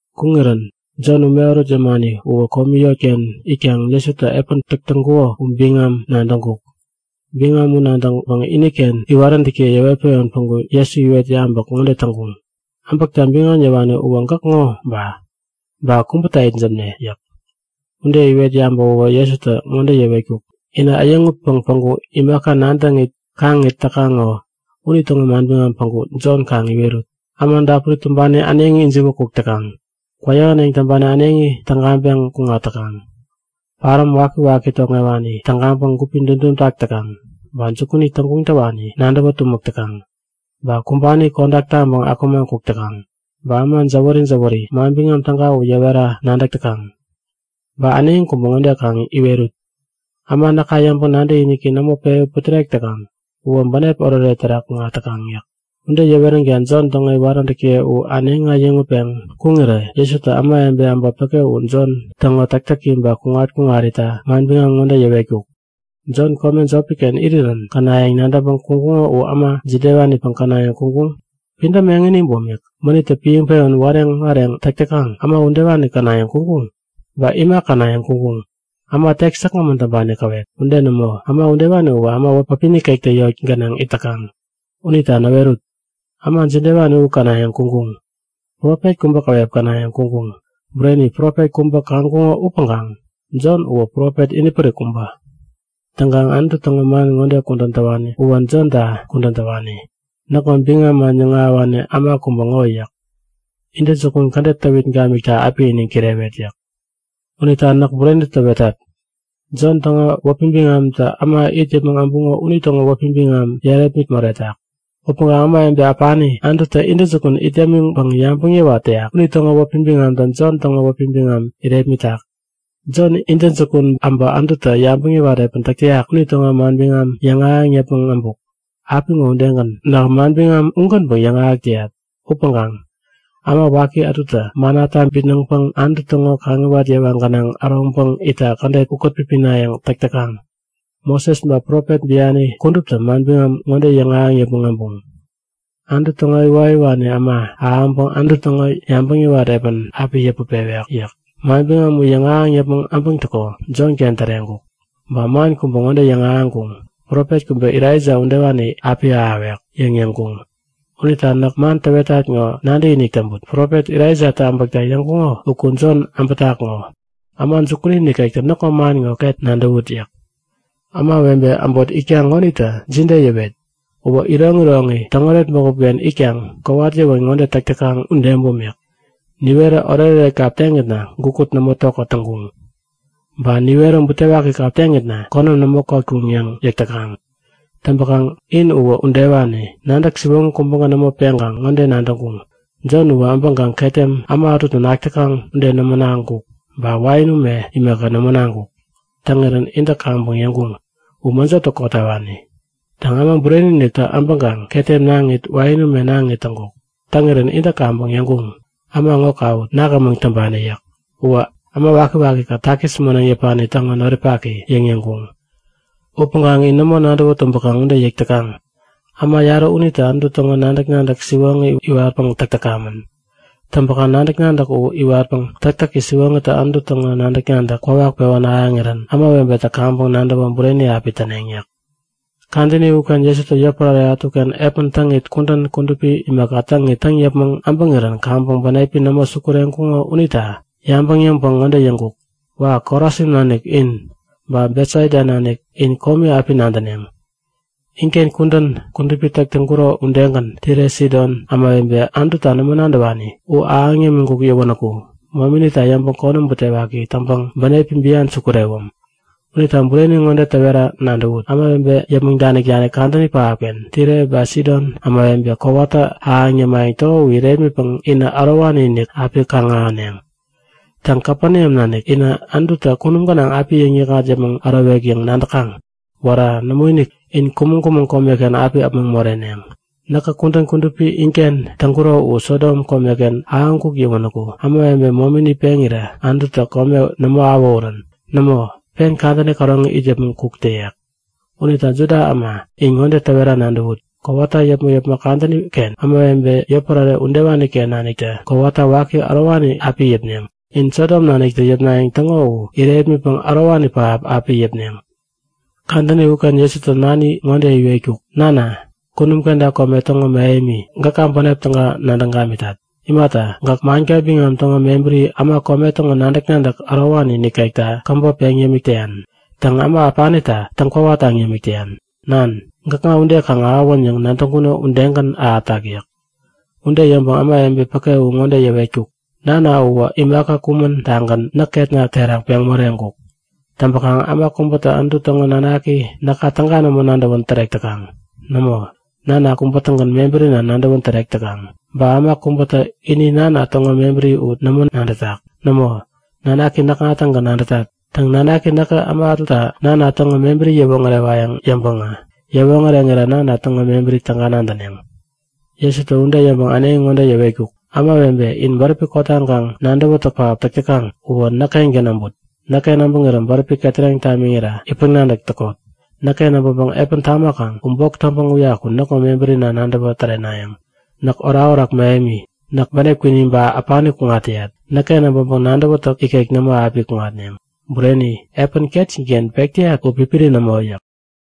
Kuŋirän Jon ume ärut yämani uwä komi yotken itkaŋ Jesutä epän täk täŋkuko u biŋam nadäŋkuk. Biŋam u nadäŋpäŋ iniken iwaräntäkiye yäwet-pewän päŋku Jesu iwet yabäk ŋode täŋkuŋ; Äbäkta biŋam yäwani uwä gäk ŋo ba? Ba kubäta itsämne? yäk. Ude iwet yabäwäwä Jesutä ŋode yäwetkuk; Inä äyäŋutpäŋ päŋku imaka nadäŋit kaŋit täkaŋ ŋo, unitäŋo manbiŋam päŋku Jon kaŋ iwerut. Äma dapuri tumbani äneŋi ijiwä kuk täkaŋ. Kwäyähäneŋ täŋpani äneŋi tägaŋpeŋ kuŋat täkaŋ. Paräm wakiwaki tokŋewani tägaŋpäŋ gupi dudum tak täkaŋ. Ba jukuni täŋguŋ täwani nadäwä tumäk täkaŋ, ba kumbani kodak taŋpäŋ akumaŋ kuk täkaŋ. Ba äma jäwäri-jäwäri Manbiŋam Täga u yäwera nadäk täkaŋ. Ba äneŋi kubä ŋode kaŋ iwerut; Äma näka yäŋpäŋ nadäkiniki nämo pewä putärek täkaŋ uwä bänep oretoret terak kuŋat täkaŋ yäk. Ude yäweränkaŋ Jon täŋo iwaräntäkiye u äneŋi äyäŋutpeŋ kuŋirä Jesutä ämawebe äbot päke u Jon täŋo täktäki ba kuŋat-kuŋarita manbiŋam ŋode yäwetkuk; Jon kome jopi-ken irirän känayäŋ nadäŋpäŋ kuŋkuŋo u äma jidewanipäŋ känayäŋ kuŋkuŋ? Pidäm eŋini bumik, mänittä piäŋpewän wareŋ-wareŋ täk täkaŋ, äma udewani känayäŋ kuŋkuŋ? Ba ima känayäŋ kuŋkuŋ? Äma tek säkgämän täŋpani käwep? Ude nämo! Äma udewani uwä äma wäpi nikektä yot gänaŋ it täkaŋ. Unita näwerut! Äma jidewani u känayäŋ kuŋkuŋ? Profet kubä käwep känayäŋ kuŋkuŋ? Bureni, profet kubä kaŋkuŋo upäŋkaŋ Jon uwä profet inipärik kubä. Täŋkaŋ Anutu täŋo man ŋode kudän täwani uwä Jonta kudän täwani; Näkŋo biŋam yäŋahäwani äma kubä ŋo yäk. Intäjukun kädet täwit gamikta api iniŋ kirewet yäk. Unita näk bureni täwetat; Jon täŋo wäpi biŋamtä äma it yäpmäŋ äbuŋo unitäŋo wäpi biŋam yärepmit moretak. Upäŋkaŋ ämawebe äpani Anututä intäjukun it yämiŋpäŋ yabäŋ yäwat täyak unitäŋo wäpi biŋamtä Jon täŋo wäpi biŋam irepmitak. Jon intäjukun äbä Anututä yabäŋ yäwat epän täk täyak unitäŋo manbiŋam yäŋahäŋ yäpmäŋ äbuk. Apiŋo udegän nähä manbiŋam ugänpäŋ yäŋahäk täyat. Upäŋkaŋ äma waki ätutä mannata bitnäŋpäŋ Anutu täŋo kaŋiwat yewa gänaŋ äroŋpäŋ itta kädet ukät-pipinayäŋ täk täkaŋ. Moses ba Profet biani kuduptä manbiŋam ŋode yäŋahäŋ yäpmäŋ äbuŋ; Anutu täŋo iwoyäwani äma ahäŋpäŋ Anutu täŋo yabäŋ yäwat epän api yäput pewek yäk. Manbiŋam u yäŋahäŋ yäpmäŋ abäŋtäko Jonken täreŋkuk. Ba man kubä ŋode yäŋahäŋkuŋ; Profet kubä Elaija udewani api ahäwek! yäŋ yäŋkuŋ. Unita näk man täwetat ŋo nadäkinik täŋput! Profet Elaijatä äbäkta yäŋkuŋo uku Jon äbätak ŋo. Äma jukuni nikektä näkŋo man ŋo ket nadäwut! yäk. Ämawebe äbot itkaŋ ŋonita jide yäwet? Uwä iroŋiroŋi täŋoret bägup-ken itkaŋ kowat yäwän ŋode täk täkaŋ ude bumik; Niwerä oretoret kap teŋitna gukut nämo tokät täŋkuŋ. Ba niwerä butewaki kap teŋitna, konäm nämo kotkuŋ yäŋ yäk täkaŋ. Täŋpäkaŋ in uwä udewani, nadäk siwoŋi kubägän nämo peŋkaŋ ŋode täŋkuŋ; Jon uwä äbäŋkaŋ ketem äma ätutä nak täkaŋ ude nämo naŋkuk ba wain ume imaka, nämo naŋkuk. Täŋirän intä kaŋpäŋ yäŋkuŋ; U mäjotä kotawani! Täŋ, Äma Bureni-iniktä äbäŋpäŋ ketem naŋit wain ume naŋit täŋkuk. Täŋirän intä kaŋpäŋ yäŋkuŋ; Äma ŋo kawut! Nak ämäŋ täŋpani! yäk. Uwä äma waki-waki-kät takis moneŋ yäpani täŋo noripaki! yäŋ yäŋkuŋ. Upäŋkaŋ in nämo nadäwä tumbäkaŋ ude yäk täkaŋ. Äma yarä unitä Anutu täŋo nadäk-nadäk siwoŋi iwatpäŋ täk täkamän. Täŋpäkaŋ nadäk-nadäk u iwatpäŋ täktäki siwoŋitä Anutu täŋo nadäk-nadäk kwawak pewän ahäŋirän ämawebetä kaŋpäŋ nadäwä bureni api täneŋ yäk. Kadäni uken Jesutä yotpärare ätuken epän täŋit kudän kudupi imaka täŋit täŋ yäpmäŋ äbäŋirän kaŋpäŋ bänepi nämo sukureŋkuŋo unita yabäŋ yäŋpäŋ ŋode yäŋkuk; Wa! Korasin nanik in, ba Betsaida nanik in komi api nadäneŋ! Inken kudän kudupi täk täŋkuro udegän Tire Sidon ämawebe, Anututa nämo nadäwani u ahäŋ yämiŋkuk yäwänäku mominita yäŋpäŋ konäm butewaki täŋpäŋ bänepi bian sukurewäm! Unita bureni ŋode täwera nadäwut; Ämawebe yäpmäŋ danik-danik kadäni pähapken Tire ba Sidon ämawebe kowata ahäŋ yämayäŋ täko u irepmitpäŋ inä ärowani-inik api kaŋ-ahäneŋ! Täŋ, Kapeneam nanik inä, Anututä kunum gänaŋ api yäŋnikŋat yäpmäŋ ärowek yäŋ nadäkaŋ? Wära! Nämoinik! In kumäŋ-kumäŋ komeken api äpmoŋ moreneŋ. Näkä kudän kudupi inken täk täŋkuro u Sodom komeken ahäŋkuk yäwänäku ämawebe momini peŋirä Anututä kome nämo awähurän. Nämo, pen kadäni käroŋi it yäpmäŋ kuk täyek. Unita Juda äma in ŋode täwera nadäwut; Kowata yäpmäk-yäpmäk kadäni-ken ämawebe yotpärare udewani-ken naniktä kowata waki ärowani api yäpneŋ. In Sodom naniktä yäpnayäŋ täŋo u irepmitpäŋ ärowani pähap api yäpneŋ. Kadäni uken Jesutä nani ŋode iwetkuk; Nana, kunum kenta kome täŋo mähemi gäka bänep täga nadäŋ gamitat. Imata, gäk manka biŋam täŋo mebäri äma kome täŋo nadäk-nadäk ärowani nikekta käbop peŋ yämik täyan. Täŋ, äma äpanita täŋ-kwawataŋ yämik täyan. Nan, gäkŋa ude kaŋ ahäwän yäŋ nadäŋkuno udegän ahätak yäk. Ude yäŋpäŋ ämawebe päke u ŋode yäwetkuk; Nana uwä imaka kumän-tagän näk ketna terak peŋ moreŋkuk. Täŋpäkaŋ äma kubätä Anutu täŋo nanaki näka täga nämo nadäwän tärek täkaŋ. Nämo, Nana kubä-tägän mebärina nadäwän tärek täkaŋ. Ba äma kubätä ini Nana täŋo mebäri u nämo nadätak. Nämo, nanaki näkŋa-tägän nadätat. Täŋ, Nanaki näkä äma ätuta Nana täŋo mebäri yäwoŋärewayäŋ yäŋpäŋä yäwoŋäreŋira Nana täŋo mebäri täga nadäneŋ. Jesutä ude yäŋpäŋ äneŋi ŋode yäwetkuk; Ämawebe in bäräpi kotaŋkaŋ nadäwätäk pähap täk täkaŋ uwä näk-kengän äbut! Näkken äbäŋirä bäräpi ketäreŋ tamiŋira itpäŋ-nadäk täkot. Näkken äbäŋkaŋ epän tamakaŋ u bok täŋpäŋ uyaku näkŋo mebärina nadäwä tärenayäŋ. Näk orakorak mähemi, näk bänep kwini ba äpani kuŋat täyat. Näkken äbäŋpäŋä nadäwätäk ikek nämo api kuŋatneŋ. Bureni, epän ketjin-ken pek täyat u pipiri nämo yäk.